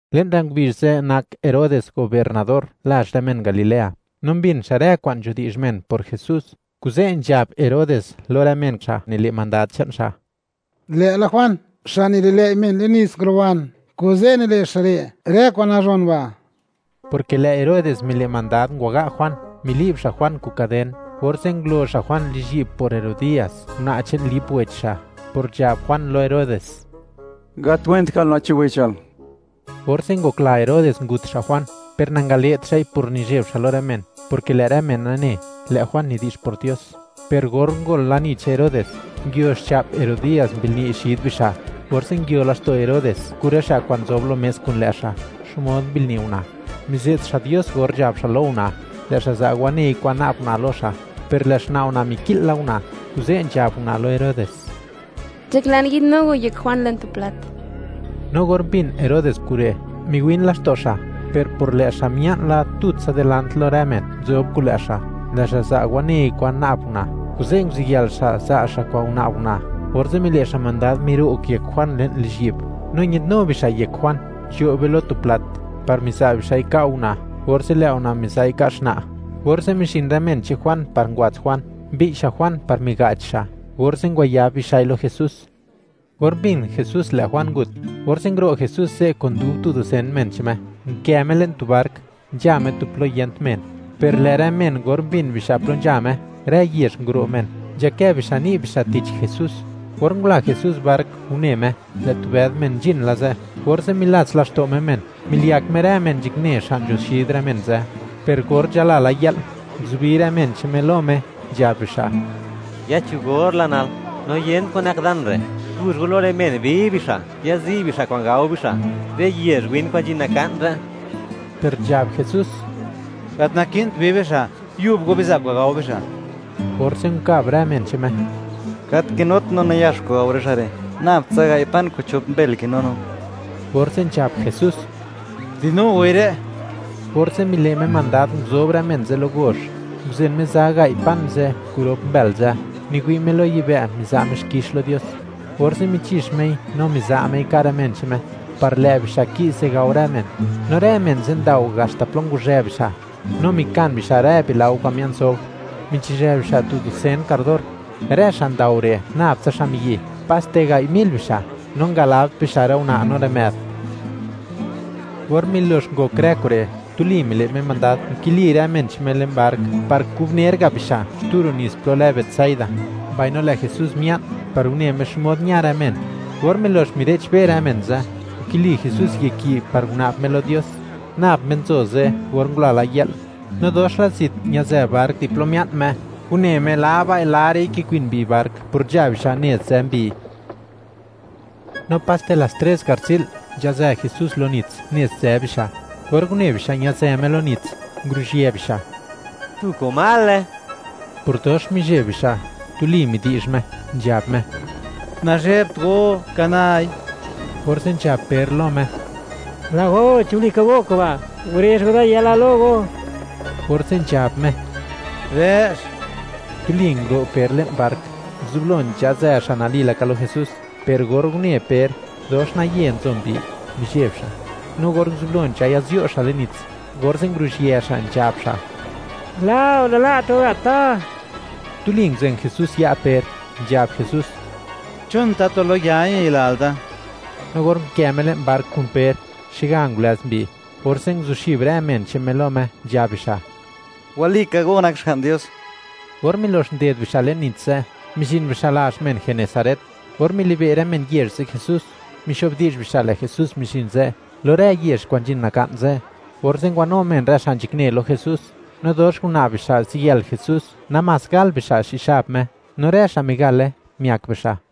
Le'n rë ngubizh ze' nak Herodes gobiernador lazh rë men Galilea, no mbin xa' rë kwa'n nzhudi'zh men por Jesús, kuze' nzhab Herodes lo rë men xa' nile' mandad che'n xa': ―Lë'la Juan xa' nililëi' men le'n nits nguruban, kuze' nile' xa' re' rë kwa'n nazhon ba'. Porke lë' Herodes mile' mandad, ngwaga' Juan, mili'b xa' Juan kun kaden, orze' ngulo xa' Juan lizhyi'b por Herodías, una' che'n Lip wech xa', por nzhab Juan lo Herodes: “Gat went ka'l una' che'n wechal.” Orze' ngokla Herodes ngut xa' Juan, per nangale't xa'i por nizheb xa' lo rë men, porke lë' rë men nane, lë' Juan nidi'zh por Dios. Per or ngol lani che'n Herodes, nguio xcha'p Herodías, mbilni' xid bixa', orze' nguio laxto' Herodes kun rë xa' kwa'n nzob lo mes kun lë' xa', xmod mbilni' una'. Mize't xa' Dios or nzhab xa' lo una', lë' xa' za' wanei kwan na'b una' lo xa'. Per lë' xna' una' miki'l la una', kuze' nzhab una' lo Herodes: “Nzhaklan yi'dnu go yek Juan, le'n tu plat.” No or mbin Herodes kure', miwin laxto' xa', per por lë' xa' mia'n la tutsa dilant lo rë men nzob kun lë' xa', lë' xa' za' wanei kwan na'b una', kuze' nguziyël xa' za' xa' kwa'n nguna'b una', orze' mile' xa' mandad, miro'g yek Juan le'n lizhyi'b, no ñadnu bixa' yek Juan, nzhoi le'n tu chë', par miza' bixa'i ka' una', orze' lë' una' miza'i ka' xna'. Orze' mizhin rë men che'n Juan par ngwats Juan, mbi'y xa' Juan par miga'ch xa', orze' ngwayab bixa'i lo Jesús. Or mbin Jesús lë' Juan ngut, orze' nguro' Jesús ze' kun dub tu dusen men che'n Me, nkë Me le'n tu bark, nzha Me tu plo yent men. Per lë' rë men, or mbin bixa' plo nzha Me, rë yezh nguro' men, nzhakë bixa' ni' bixa', tich Jesús. Or ngula Jesús bark, une Me, lë' tu bëd men nzhin la ze', orze' milats laxto' Me men, miliyak Me rë men nzhakne xa' nzho xid rë men ze'. Per or nzhala la yë'l, nguzubi rë men che'n Me lo Me nzhab bixa': ―Ya cho gor la nal, no yent kwa'n nak dan re'. Guzh go lo rë men, bi bixa', yazi' bixa' kwa'n gao bixa' rë yezh win kwa'n nzhin naka'n re'. Per nzhab Jesús: ―Gat naki'nt bi bixa'; ¡yub go biza' kwa'n gao bixa'! Orze' nkab rë men che'n Me: ―Gat kinut no nayax kwa'n gao rë xa' re', nab tsa gai' pan kun chop mbël kinu no. Orze' nzhab Jesús: ―Dinu goi re'. Orze' mile' Me mandad, nguzob rë men ze' lo gozh, nguzen Me za gai' pan ze' kun rop mbël ze', miwi' Me lo yibë', miza' Me xkix lo Dios. Orze' michi'x Mei, no miza' Mei ka' rë men che'n Me; par lë' bixa' ki'ze gao rë men. No rë men ze' ndao haxta plo nguzhë bixa'. No mikan bixa' rë bilao kwa'n mia'n sobr; michizhë bixa' tu dusen kardor. Rë xa' ndao re', nab tsa xa' miyi', paste gai' mil bixa', no ngalabt bixa' rë una' no rë më'd. Or milox ngok rë kure', tuli mile' Me mandad, nkili rë men che'n Me le'n bark par kubner ga' bixa' xtu ro' nits plo lë Betsaida; mbaino lë' Jesús mia'n par une Me xmod ña rë men. Or milox mire'chbe rë men ze', nkili Jesús yek yi' par nguna'b Me lo Dios. Nab Me nzo ze' or ngula la yë'l. No dox la zit ñazë bark di plo mia'n Me, une Me labai-larei kikwin mbi bark por nzha bixa' nez nzë mbi. No paste las tres garzi'l, nzhazë Jesús lo nits nez nzë bixa'. Or une bixa' ñë'dzë Me lo nits, nguruzhië bixa': “¡Tu komale!”, por dox mizheb bixa'. Tuli midi'zh Me, nzhab Me: ―¡Nazhebt go! ¡Ka nai! Orze' nzhab Per lo Me: ―¡Lë' go!, chi walika go kuba', gurezh go da yala lo go. Orze' nzhab Me: ―¡Dë'x! Tuli nguro' Per le'n bark, nguzublo nzhazë xa' nali laka lo Jesús, per or une Per, dox naye nzo mbi, mizheb xa', no or nguzublo nzhaya'zyuo xa' le'n nits, orze' nguruzhië xa', nzhab xa': ―¡Lë'o!, ¡nala't go gat da! Tuli nguzen Jesús ya' Per, nzhab Jesús: ―¿Chon tatu lo ya ñayilal da? No or unkë Me le'n bark kun Per, xega ngulëz mbi, orze' nguzuxib rë men che'n Me lo Me, nzhab bixa': ―¡Walika go nak Xga'n Dios! Or milox nded bixa' le'n nits ze', mizhin bixa' lazh men Genesaret. Or mili'be' rë men yezh ze' Jesús, mixo'bdi'zh bixa', lë' Jesús mizhin ze', lo rë yezh kwa'n nzhin naka'n ze'. Orze' ngwanu men rë xa' nzhakne lo Jesús, no dox nguna'b bixa' ziyël Jesús, namás gal bixa' xi' xab Me, no rë xa' migale, miak bixa'.